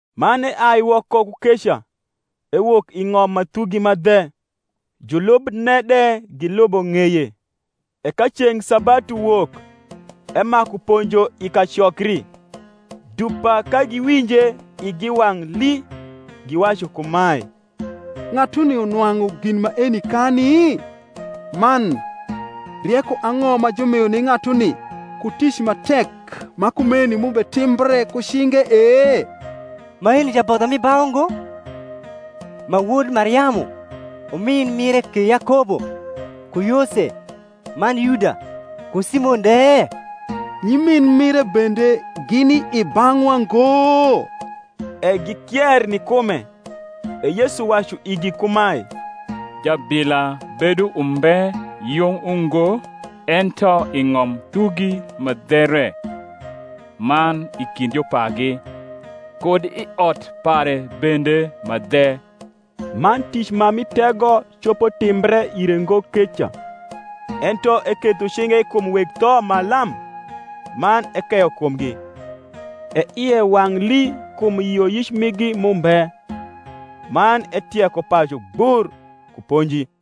Man eai woko ku keca; ewok i ng’om ma thugi ma dhe; julubne de gilubo ng’eye. E ka ceng’ sabatu wok, emaku ponjo i kacokri: dupa ka giwinje igi wang’ lii, giwacu kumae, Ng’atuni nwang’u gin maeni kani? man, rieko ang’o ma jumio ni ng’atuni, ku tic ma tek ma kumeni m’ubetimbre ku cinge e? Maeni jabodho mi bau ngo, ma wod Mariamu, umin mire ke Yakobo, ku Yose, man Yuda, ku Simon de? nyimin mire bende gini i bang’wa ngo? E gikier ni kume. E Yesu wacu igi kumae, Jabila bedo umbe yung ungo ento i ng’om thugi ma dhe re, man i kind jupagi, kud i ot pare bende ma dhe. Man tic ma mi tego copo timbre ire ngo keca, ento eketho cinge kum weg tho ma lam, man ekeyo kumgi. E ie wang’ lii kum yioyic migi m’umbe. Man etieko pacu gbur ku ponji.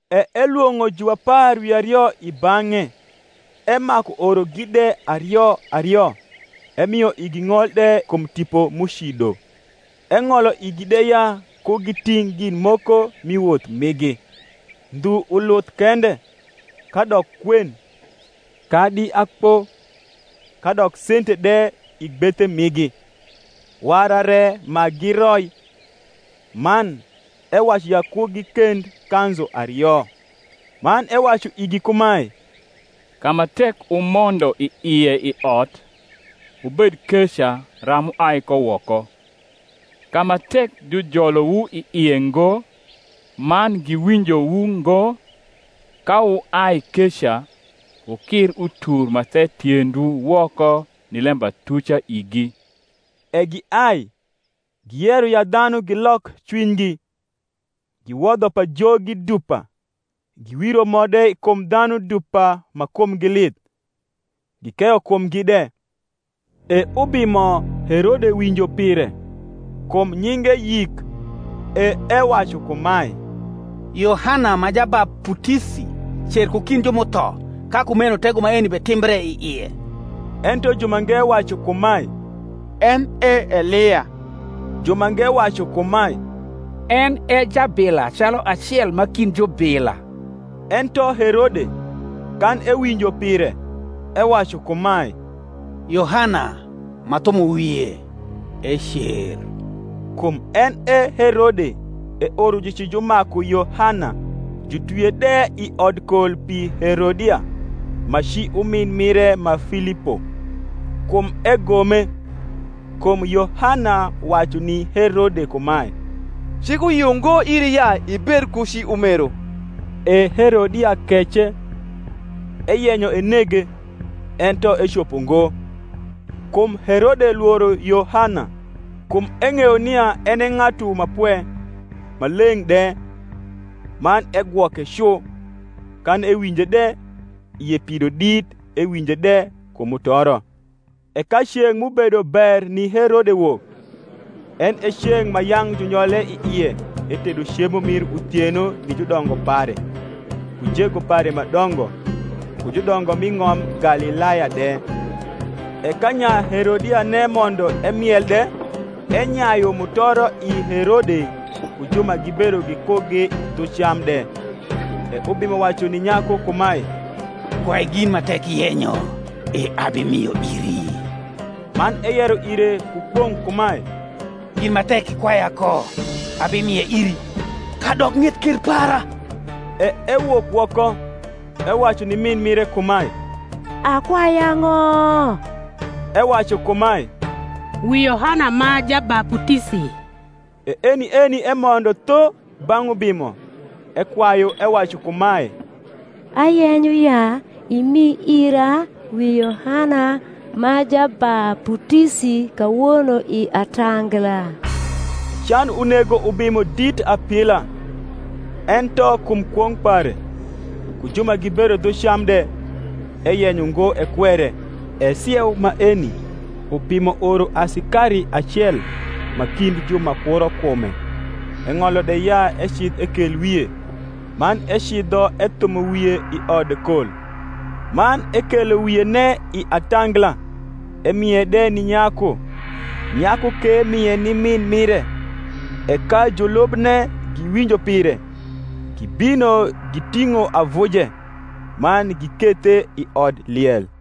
E elwong’o juapar wi ario i bang’e, emaku orogi de ario ario; emio igi ng’ol de kum tipo m’ucido; eng’oio igi de ya ku giting’ gin moko mi woth migi, ndhu uluth kende; kadok kwen, kadi akpo, kadok sente de i gbethe migi; wara re ma giroi: man, ewacu ya ku gikend kanzu ario. Man ewacu igi kumae, Ka ma tek wumondo i ie i ot, wubed keca ram wuai ko woko. Ka ma tek jujolowu i ie ngo, man giwinjowu ngo, ka wuai keca, wukir utur ma the tiendwu woko ni lembatuca igi. E giai, giyero ya dhanu gilok cwinygi. Giwodho pajogi dupa, giwiro mo de kum dhanu dupa ma kumgi lith, gikeyo kumgi de. E ubimo Herode winjo pire; kum nyinge yik: e ewacu kumae, Yohana ma Jabaputisi cer ku kind ju m’utho, ka kumeno tego maeni betimbre i ie. Ento jumange wacu kumae, En e Elia. Jumange wacu kumae, En e jabila calu acel ma kind jubila. Ento Herode, kan ewinjo pire, ewacu kumae, Yohana, m’athumo wie, ecer. Kum en e Herode eoro jucijumaku Yohana, jutwie de i odkol pi Herodia, ma ci umin mire ma Filipo: kum egome. Kum Yohana wacu ni Herode kumae, Cik uyio ngo iri ya ibed ku ci umeru. E Herodia kece, eyenyo enege; ento ecopo ngo; kum Herode lworo Yohana, kum eng’eyo nia en e ng’atu ma pwe, ma leng’ de, man egwoke cu. Kan ewinje de, ie pido dit; ewinje de ku mutoro. E ka ceng’ m’ubedo ber ni Herode wok, en e ceng’ ma yang’ junyole i ie etedo cemo mir uthieno ni judongo pare, ku jego pare ma dongo, ku judongo m’i ng’om Galilaya de; e ka nya Herodiane mondo emiel de, enyayu mutoro i Herode ku ju ma gibedo gikugi dhu cam de; e ubimo wacu ni nyaku kumae, Kwai gin ma tek iyenyo, e abimio iri. Man eyero ire ku kwong’ kumae, Gin ma tek ikwaya ko, abimie iri, kadok ng’et ker para. E ewok woko, ewacu ni min mire kumae, Akwai ang’o? Ewacu kumae, Wi Yohana ma Jabaputisi. E eni eni emondo tho bang’ ubimo, ekwayu, ewacu kumae, Ayenyo ya imi ira wi Yohana ma Jabaputisi kawono i atangla. E can unego ubimo dit apila; ento kum kwong’ pare, ku ju ma gibedo dhu cam de, eyenyo ngo ekwere. E sieu maeni ubimo oro asikari acel ma kind ju ma kuro kume, eng’olo de ya ecidh ekel wie: man ecidho ethumo wie i odkol, man ekelo wiene i atangla, emie de ni nyaku; nyaku ke mie ni miu mire. E ka julubne giwinjo pire, gibino giting’o avuje, man gikethe i odliel.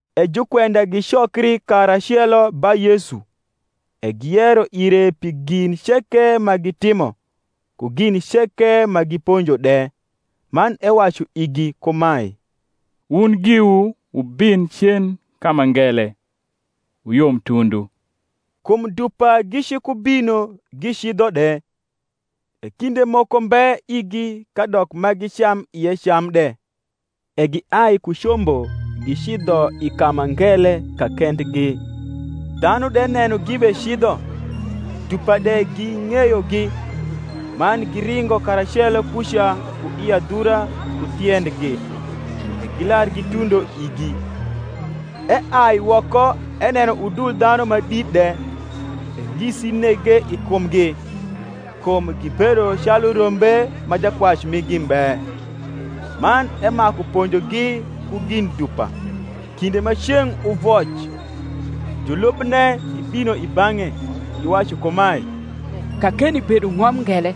E jukwenda gicokri karacelo ba Yesu: e giyero ire pi gin ceke ma gitimo, ku gin ceke ma giponjo de. Man ewacu igi kumae, Wun giwu wubin cen ka ma ngele, wuyom tundu. Kum dupa gicikubino gicidho de, e kinde moko mbe igi kadok ma gicam ie cam de. E giai ku combo gicidho i ka ma ngele kakendgi. Dhanu de neno gibecidho, dupa de ging’eyogi, man giringo karacelo kuca ku i adhura ku tiendgi, e gilar gitundo igi. Eai woko eneno udul dhanu ma dit de, e ngisi nege i kumgi, kum gibedo calu rombe ma jakwac migi mbe: man emaku ponjogi ku gin dupa. Kinde ma ceng’ uvoc, julubne gibino i bang’e, giwacu kumae, Kakeni bedo ng’om ngele,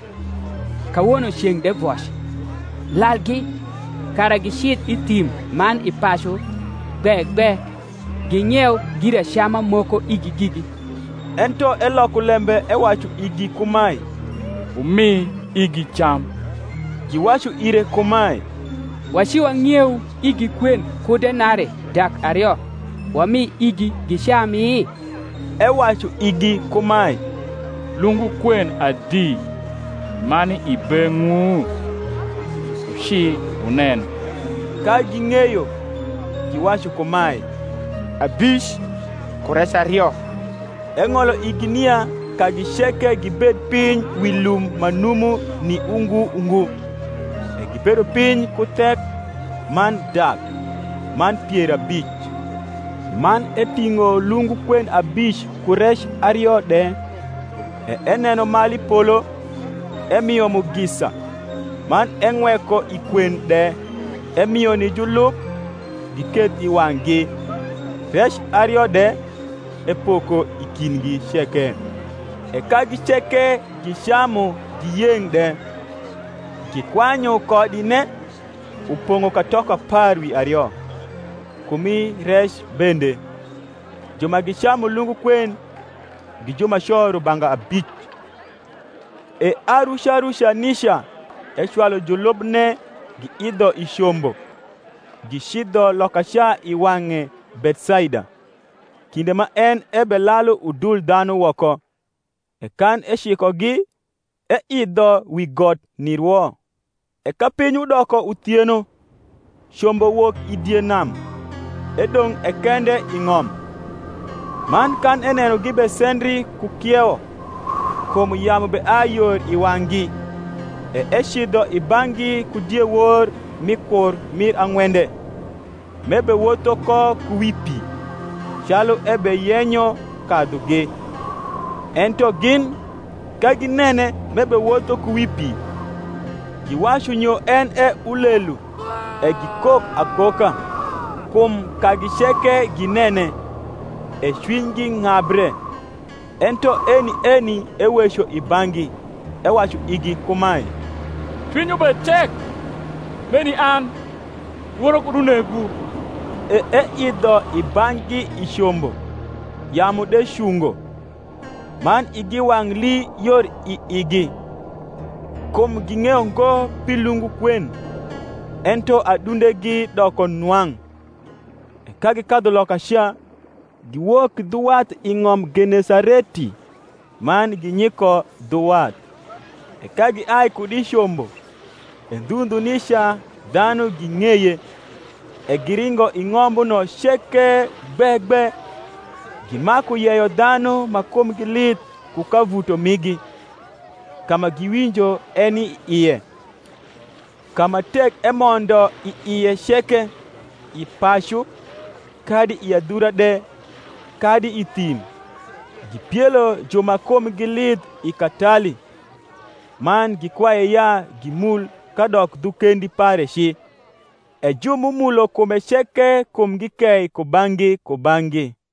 kawono ceng’ de voc; lalgi, kara gicidh i thim man i pacu gbe gbe, ging’ieu giracama moko igi gigi. Ento eloko lembe ewacu igi kumae, Wumi igi cam. Giwacu ire kumae, Waciwang’ieu igi kwen ku denarii dak ario, wami igi gicami? Ewacu igi kumae, Lungu kwen adi ma ni i beng’wu? wuci wunen. Ka ging’eyo, giwacu kumae, Abic, ku rec ario. Eng’olo igi nia kagi ceke gibed piny wi lum ma numu ni ungu ungu. E gibedo piny ku thek, man dak, man pier abic. Man eting’o lungu kwen abic ku rec ario de, e eneno malu i polo, emio mugisa, man eng’weko i kwen de; emio ni julub giketh i wang’gi; rec ario de epoko i kindgi ceke. E kagi ceke gicamu, giyeng’ de. Gikwanyu kodine, upong’o katoko apar wi ario, ku mi rec bende. Ju ma gicamu lungu kwen gi jumaco rubanga abic. E aruca ruca nica ecwalu julubne giidho i combo, gicidho lokaca i wang’e Bethsaida, kinde ma en ebelalu udul dhanu woko. E kan ecikogi, eidho wi got nirwo. E ka piny udoko uthieno, combo wok i die nam, edong’ e kende i ng’om. Man kan eneno gibesendri ku kiewo, kum yamu beai yor i wang’gi, e ecidho i bang’gi ku diewor mi kur mir ang’wende, m’ebewotho ko ku wi pi; calu ebeyenyo kadhugi: ento gin, ka ginene m’ebewotho ku wi pi; giwacu nyo en e ulelu, e gikok akoka; kum kagi ceke ginene, e cwinygi ng’abre. Ento eni eni eweco i bang’gi, ewacu igi kumae, Cwinywu bed tek: meni an; lworo kud unegwu. E eidho i bang’gi i combo; yamu de cungo: man igi wang’ hi yor i igi; kum ging’eyo ngo pi lungu kwen, ento adundegi doko nwang’. E ka gikadhu lokaca, giwok dhu wath i ng’om Genesareti, man ginyiko dhu wath. E ka giai kud i combo, e ndhu ndhu nica dhanu ging’eye. e giringo i ng’ombuno ceke gbe gbe, gimaku yeyo dhanu ma kumgi lith ku kavuto migi, ka ma giwinjo eni i ie. Ka ma tek emondo i ie ceke, i pacu, kadi i adhura de, kadi i thim, gipielo ju ma kumgi lith i katali, man gikwaye ya gimul kadok dhu kendi pare ci: e ju m’umulo kume ceke kumgi kei kubang’gi kubang’gi.